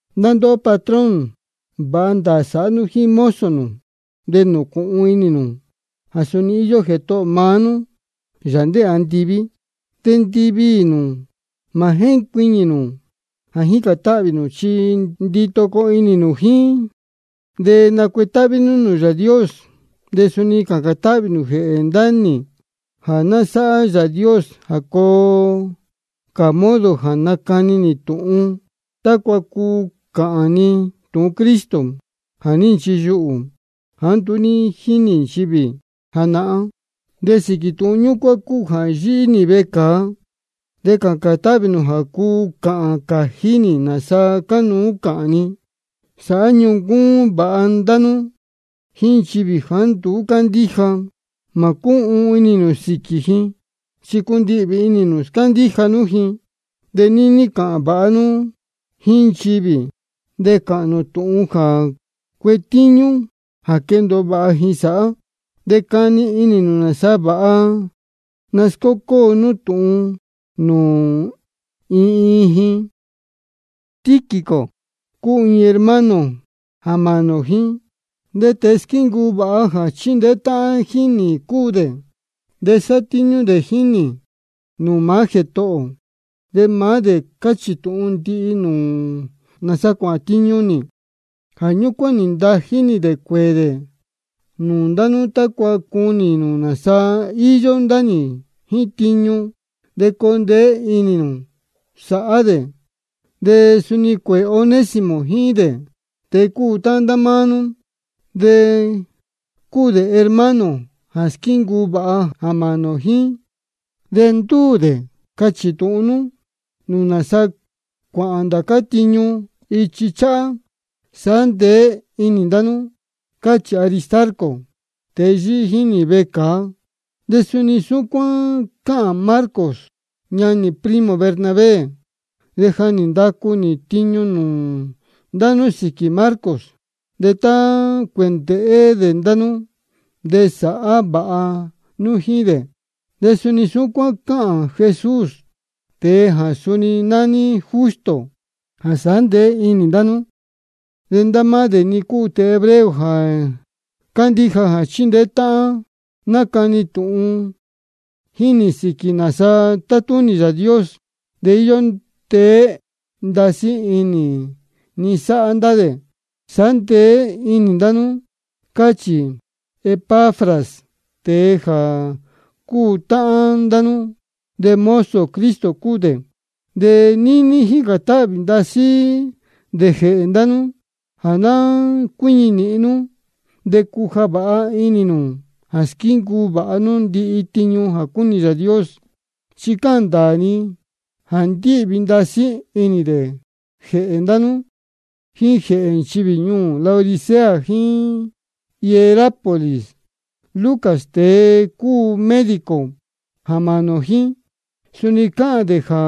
Ndá ndóhó patrón, vāha ndāā sāhá nú jíín mozo nū. De nūcūhun inī nū jā suni íyó Jētohō maá nú, Yāā ndéē andiví. De ndiviī nū mā jéncuiñī nū jā jícān táhvī nū, chi ndito coo inī nū jíín, de nacuetáhví nú nūū Yāā Dios. De suni cācān táhvī nū jēhē ndá nī, jā ná sáhá Yāā Dios jā coo cā modo jā nacani nī tūhun, tácua cuu cāhān ni tūhun Cristo jā ní nchiyuhū, jāá nduú ní jínī nchivī janahán. De sīquī tūhun ñúcuán cúu jā yíhí nī vecāa. De cācān táhvī nū jā cuu cāhān cājí nī nāsa cánuú cāhān ni. Sāhá ñuncúún vāha ndá nú jíín nchivī jāá nduú cándíja. Mā cúhuun inī nū sīquī ji, chi cundihvī inī nū scándíja nú ji. De níní cāhān vāha nú jíín nchivī, de cāhān nū tūhun jā cuetíñú jā quendōo vāha ji sāhá. De cani inī nū nāsa vāha nascócóo nú tūhun nūū iin iin ji. Tíquico cúu iin hermano jā mānī ō jíín, de tēe squíncuu vāha jā chíndeé táhán jíín nī cúu dē, de sátíñú dē jíín nī nūū maá Jētohō ō. De maá dē cachī tūhun ndihi nūū nū nāsa cuāhān tiñu nī. Jā ñúcuán nī ntají nī dē cuēē dē nūū ndá nú, tácua cunī nū nāsa íyó ndá nī jíín tiñu, de coo ndeé inī nū sāhá dē. De suni cuēē Onésimo jíín dē, tēe cúu táhán ndá máá nú. De cúu dē hermano jā squíncuu vāha jā mānī ō jíín. De ndúū dē cachī tūhun nūū nū nāsa cuāhān ndācá tiñu ichi cháhá. Sāhá ndeé inī ndá nú, cáchī Aristarco, tēe yíhí jíín nī vecāa. De suni súcuán cáhān Marcos, ñanī primo Bernabé. De ja nī ndacu nī tiñu nūū ndá nú sīquī Marcos, de tá cuēndēhé dē ndá nú de sāhá vāha nú jíín dē. De suni súcuán cáhān Jesús, tēe jā suni nání Justo, jā sāhá ndeé inī ndá nú. De ndá máá dē-ni cúu tēe hebreo jā cándíja jā chíndeé táhán nácani tūhun jíín nī sīquī nāsa tátúnī Yāā Dios. De íyó ndeé ndasí inī ni sáhá ndá dē. Sāhá ndeé inī ndá nú, cáchī Epafras, tēe jā cúu táhán ndá nú, de mozo Cristo cúu dē. De níní jícān táhvī ndasí dē jēhē ndá nú, jā ná cuíñi nīhin nú, de cuja vāha inī nū jā squíncuu vāha nú ndihi tiñu jā cúnī Yāā Dios. Chi cáhān ndāā ni jā ndíhvī ndasí inī dē jēhē ndá nú, jíín jēhē nchivī ñuū Laodicea jíín Hierápolis. Lucas, tēe cúu médico jā mānī ō jíín, suni cáhān dē jā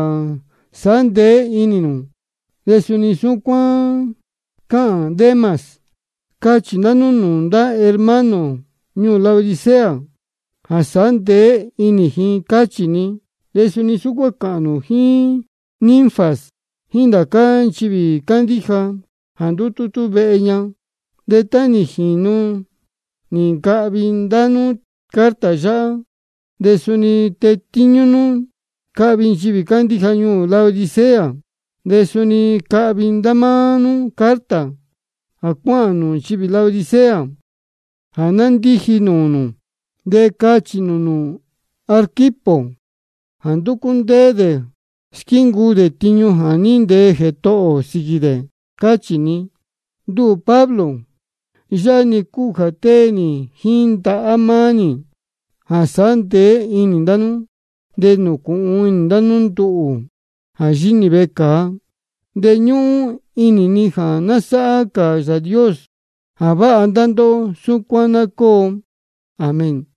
sāhá ndeé inī nū, de suni súcuán cáhān Demas. Cachī ndá nú nūū ndá hermano ñuū Laodicea jā sāhá ndeé inī ji, cáchī ni. De suni súcuán cāhān nū jíín Ninfas, jíín ndācá nchivī cándíja jā ndútútú vehe ña. De tá nī jīnu nī ncahvi ndá nú carta yáhá, de suni tetíñú nú cahvi nchivī cándíja ñuū Laodicea. De suni cahvi ndá máá nú carta jā cuáhān nūū nchivī Laodicea jā ndiji nūū nū. De cachī nū nūū Arquipo jā nducú ndéé dē squíncuu dē tiñu jā ní ntee Jētohō ō sīquī dē, cáchī ni. Nduhū Pablo, yáhá-ni cúu jā tée nī jíín ndahá maá nī, jā sāhá ndeé inī ndá nú. De nūcūhun inī ndá nú nduhū jā yíhí nī vecāa. De ñúhún inī ni jā ná sáhá cā Yāā Dios jā váha ndá ndóhó. Súcuán ná cóo. Amén.